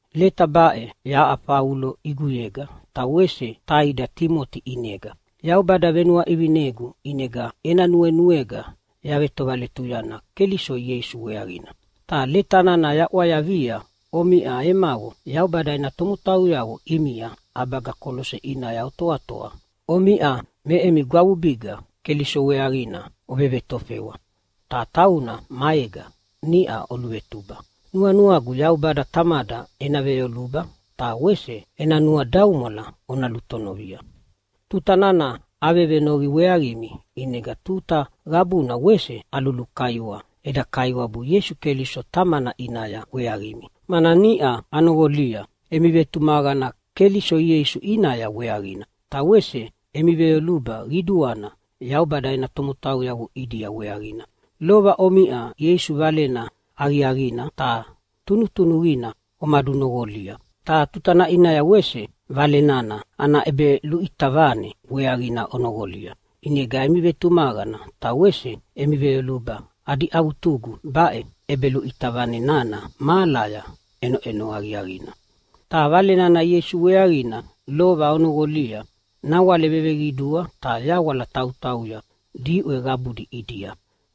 Leta baʼe yaʼa Faulo ʼiguyega, ta wese taida Timoti ʼinega. Yaubada venuaʼivinegu ʼinega ena nuenuega yavetovaletuyana Keliso Ieisu weaqina. Ta leta nana yaʼwayavia omiʼa emavo Yaubada ena tomotauyavo ʼimia ʼabaga Kolose ʼinaya otoatoa. Omiʼa me emi gwavubiga Keliso weaqina ovevetofewa, ta tauna maega niʼa oluvetuba. Nuanuagu Yaubada Tamada ena veyoluba ta wese ena nuadaumwala ona lutonovia. Tuta nana avevenoqi weaqimi, ʼinega tuta qabuna wese alulukaiwa eda Kaiwabu Ieisu Keliso Tamana ʼinaya weaqimi, mana niʼa anoqolia emi vetumaqana Keliso Ieisu ʼinaya weaqina, ta wese emi veyoluba qiduana Yaubada ena tomotauyavo ʼidia weaqina. Lova omiʼa Ieisu Valena Aqiaqina ta tunutunuqina omadunoqolia, ta tutana ʼinaya wese Vale nana ana ʼebeluʼita vane weaqina onoqolia. ʼInega emi vetumaqana ta wese emi veyoluba adi avutugu baʼe ʼebeluʼita vane nana mahalaya ʼenoʼeno aqiaqina. Ta Vale nana Ieisu weaqina lova onoqolia nawale veveqidua ta yawala tautauya diʼwe qabudi ʼidia.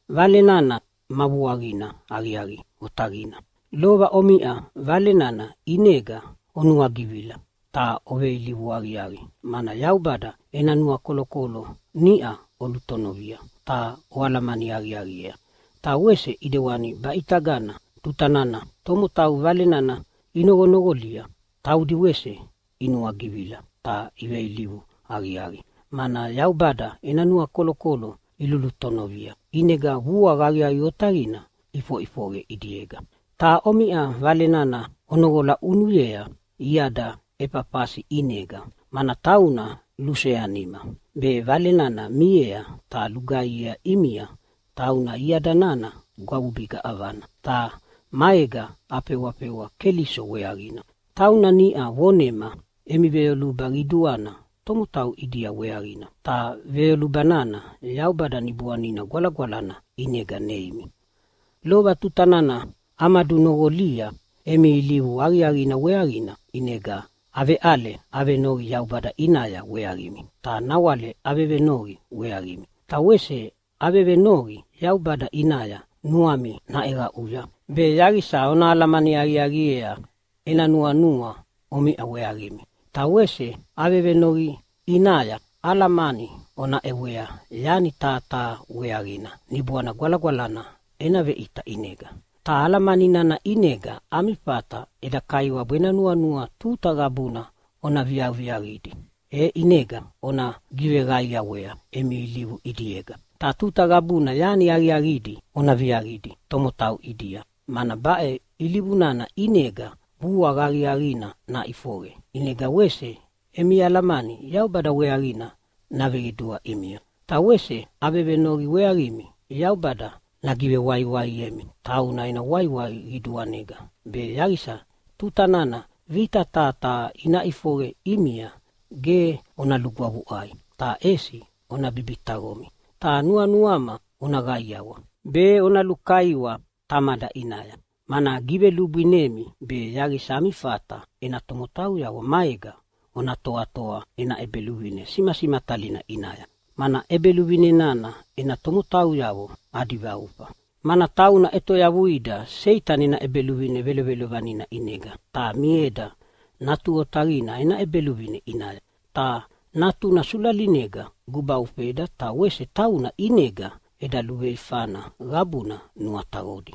Vale nana ma vuaqina aqiaqi otaqina. Lova omiʼa Vale nana ʼinega onuagivila ta oveilivu aqiaqi, mana Yaubada ena nuakolokolo niʼa olutonovia ta oalamani aqiaqiea. Ta wese ʼidewani baʼitaga tuta nana tomotau Vale nana inoqonoqolia taudi wese inuagivila ta iveilivu aqiaqi, mana Yaubada ena nuakolokolo ilulutonovia, ʼinega vuaqa aqiaqi otaqina ʼifoʼifoqe ʼidiega. Ta omiʼa Vale nana onoqola ʼunuyea iada Efafasi ʼinega, mana tauna luseanima be Vale nana miea ta lugaihiea ʼimia. Tauna iada nana gwavubiga ʼavana, ta maega afewafewa Keliso weaqina. Tauna niʼa vonema emi veyoluba qiduana tomotau ʼidia weaqina, ta veyoluba nana Yaubada Niboanina Gwalagwalana ʼinega neimi. Lova tuta nana amadunoqolia emi ilivu aqiaqina weaqina ʼinega aveʼale venoqi Yaubada ʼinaya weaqimi, ta nawale avevenoqi weaqimi. Ta wese avevenoqi Yaubada ʼinaya nuami naʼeqaʼuya, be yaqisa ona alamani aqiaqiea ena nuanua omiʼa weaqimi. Ta wese avevenoqi ʼinaya alamani ona ʼewea yani taha taha weaqina Niboana Gwalagwalana ena veʼita ʼinega. Ta alamani nana ʼinega ami fata eda Kaiwabu ena nuanua tuta qabuna ona viaviaqidi, e ʼinega ona giveqaiawea emi ilivu ʼidiega. Ta tuta qabuna yani aqiaqidi ona viaqidi tomotau ʼidia, mana baʼe ilivu nana ʼinega vuaqa aqiaqina naʼifoqe, ʼinega wese emi alamani Yaubada weaqina naveqidua ʼimia. Ta wese avevenoqi weaqimi Yaubada nagivewaiwaiemi tauna ena waiwai qiduanega, be yaqisa tuta nana vita taha taha ina ʼifoqe ʼimia ge ona lugwavuʼai ta ʼesi ona bibitaqomi. Ta nuanuama ona qaiawa be ona lukaiwa Tamada ʼinaya, mana givelubwinemi be yaqisa ami fata ena tomotauyavo maega ona toatoa ena ʼEbeluvine simasimatalina ʼinaya, mana ʼEbeluvine nana ena tomotauyavo adi vaufa. Mana tauna ʼetoyavuida Seitani ena ʼebeluvine velovelovanina ʼinega, ta mieda Natu Otaqina ena ʼEbeluvine ʼinaya. Ta Natuna sulalinega gubaufeda ta wese tauna ʼinega eda luveifana qabuna nuataqodi.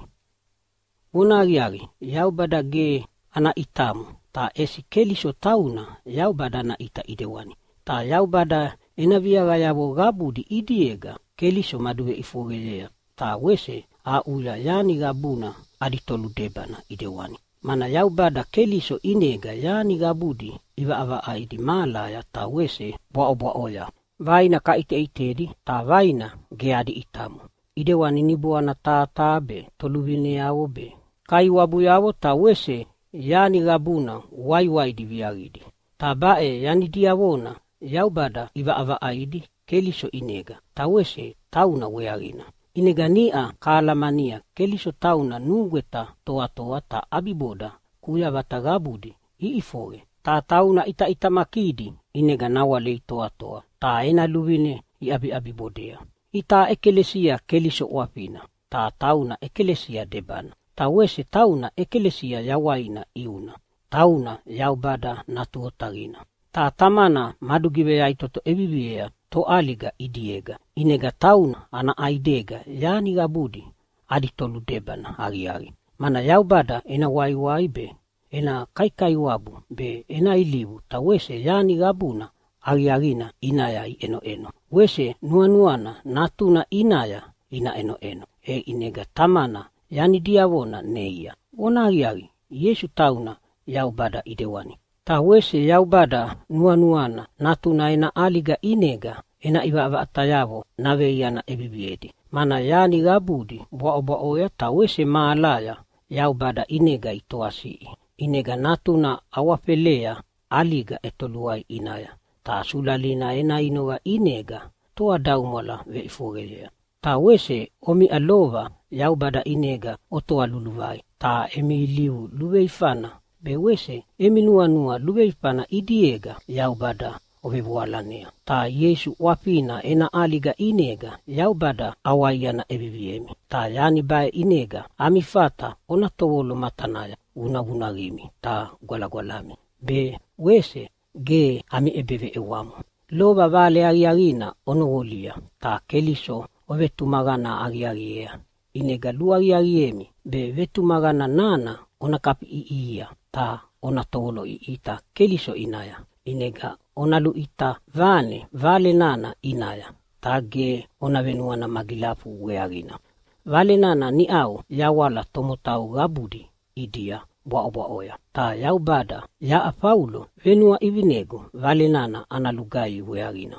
Vonahaqiaqi, Yaubada ge ana ʼitamo, ta ʼesi Keliso tauna Yaubada ana ʼita ʼidewani. Ta Yaubada ena viaqayavo qabudi ʼidiega Keliso maduveʼifoqeyea ta wese aʼuya yani qabuna adi toludebana ʼidewani. Mana Yaubada Keliso ʼinega yani qabudi ʼivaʼavaʼaidi mahalaya ta wese bwaʼobwaʼoya, vaina kaʼiteʼitedi ta vaina ge adi ʼitamo ʼidewani niboana taha taha be, toluvineavo be, kaiwabuyavo ta wese yani qabuna waiwaidi viaqidi. Ta baʼe yani diavona Yaubada ʼivaʼavaʼaidi Keliso ʼinega, ta wese tauna weaqina. ʼInega niʼa kahalamania Keliso tauna nugweta toatoa, ta ʼabiboda kuyavata qabudi iʼifoqe, ta tauna ʼitaʼitamakidi ʼinega nawale itoatoa ta ena luvine iʼabiʼabibodea. Itaʼa ʼekalesia Keliso ʼwafina, ta tauna ʼekalesia debana. Ta wese tauna ʼekalesia yawaina ʼiuna. Tauna Yaubada Natu Otaqina, ta Tamana madugiveyaʼitoto ʼeviviea toʼaliga ʼidiega, ʼinega tauna ana ʼaidega yani qabudi adi toludebana aqiaqi. Mana Yaubada ena waiwai be, ena kaikaiwabu be, ena ilivu ta wese yani qabuna aqiaqina ʼinaya iʼenoʼeno wese nuanuana Natuna ʼinaya ina ʼenoʼeno, e ʼinega Tamana yani diavona neia. Vonahaqiaqi, Ieisu tauna Yaubada ʼidewani. Ta wese Yaubada nuanuana Natuna ena ʼaliga ʼinega ena ʼivaʼavaʼatayavo naveiana ʼeviviedi, mana yani qabudi bwaʼobwaʼoya ta wese mahalaya Yaubada ʼinega itoasiʼi. ʼInega Natuna awafelea ʼaliga ʼetoluai ʼinaya ta sulalina ena inoqa ʼinega toadaumwala veʼifoqeyea. Ta wese omiʼa lova Yaubada ʼinega otoa luluvai ta emi ilivu luveifana be wese emi nuanua luveifana ʼidiega Yaubada ovevoalanea. Ta Ieisu ʼwafina ena ʼaliga ʼinega Yaubada ʼawaiana ʼeviviemi. Ta yani baʼe ʼinega ami fata ona tovolo matanaya vunavunaqimi ta gwalagwalami be wese ge ami ʼebeveʼewamo. Lova Vale Aqiaqina onoqolia ta Keliso ovetumaqana aqiaqiea, ʼinega luaqiaqiemi be vetumaqana nana ona kafiʼiʼihia ta ona tovoloʼiʼita Keliso ʼinaya. ʼInega ona luʼita vane Vale nana ʼinaya ta ge ona venuana magilafu weaqina. Vale nana niʼau yawala tomotau qabudi ʼidia bwaʼobwaʼoya. Ta Yaubada yaʼa Faulo venuaʼivinegu Vale nana ana lugaihi weaqina.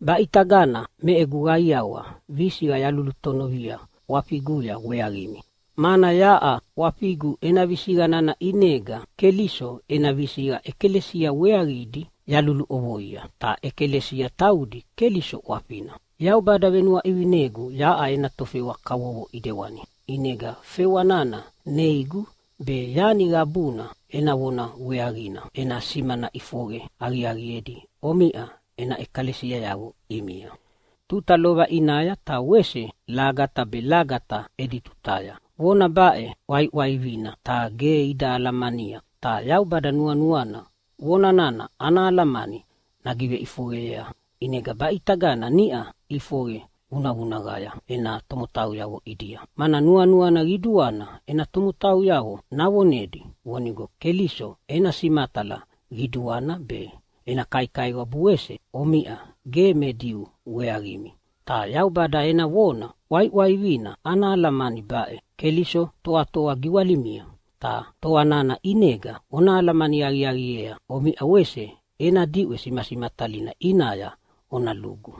Baʼitagana me egu qaiawa visiqa yalulutonovia ʼwafiguya weaqimi, mana yaʼa ʼwafigu ena visiqa nana ʼinega Keliso ena visiqa ʼekalesia weaqidi yaluluʼovoia, ta ʼekalesia taudi Keliso ʼwafina. Yaubada venuaʼivinegu yaʼa ena tofewa kavovo ʼidewani, ʼinega fewa nana neigu be yani qabuna ena vona weaqina ena simana ʼifoqe aqiaqiedi omiʼa ena ʼekalesiayavo ʼimia. Tuta lova ʼinaya ta wese lagata be lagata edi tutaya vona baʼe ʼwaiʼwaivina ta ge ida alamania. Ta Yaubada nuanuana vona nana ana alamani nagiveʼifoqeyea, ʼinega baʼitaga niʼa ʼifoqe vunavunaqaya ena tomotauyavo ʼidia. Mana nuanuana qiduana ena tomotauyavo navonedi vonigo Keliso ena simatala qiduana be ena kaikaiwabu wese omiʼa ge me Diu weaqimi. Ta Yaubada ena vona ʼwaiʼwaivina ana alamani baʼe: Keliso toatoa giwalimia, ta toa nana ʼinega ona alamani aqiaqiea omiʼa wese ena diʼwe simasimatalina ʼinaya ona lugu.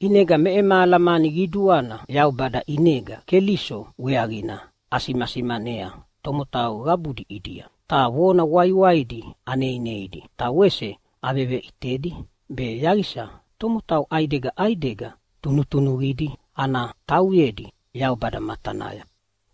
ʼInega me ema alamani qiduana Yaubada ʼinega Keliso weaqina asimasimanea tomotau qabudi ʼidia. Ta vona waiwaidi aneineidi ta wese aveveʼitedi be yaqisa tomotau ʼaidega ʼaidega tunutunuqidi ana tauyedi Yaubada matanaya.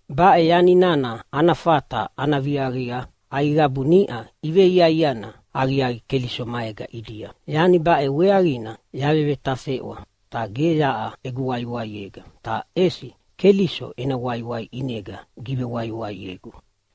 Baʼe yani nana ana fata ana viaqia aiqabu niʼa iveiaiana aqiaqi Keliso maega ʼidia Yani baʼe weaqina yavevetafeʼwa, ta ge yaʼa egu waiwiaega, ta ʼesi Keliso ena waiwai ʼinega givewaiwaiegu.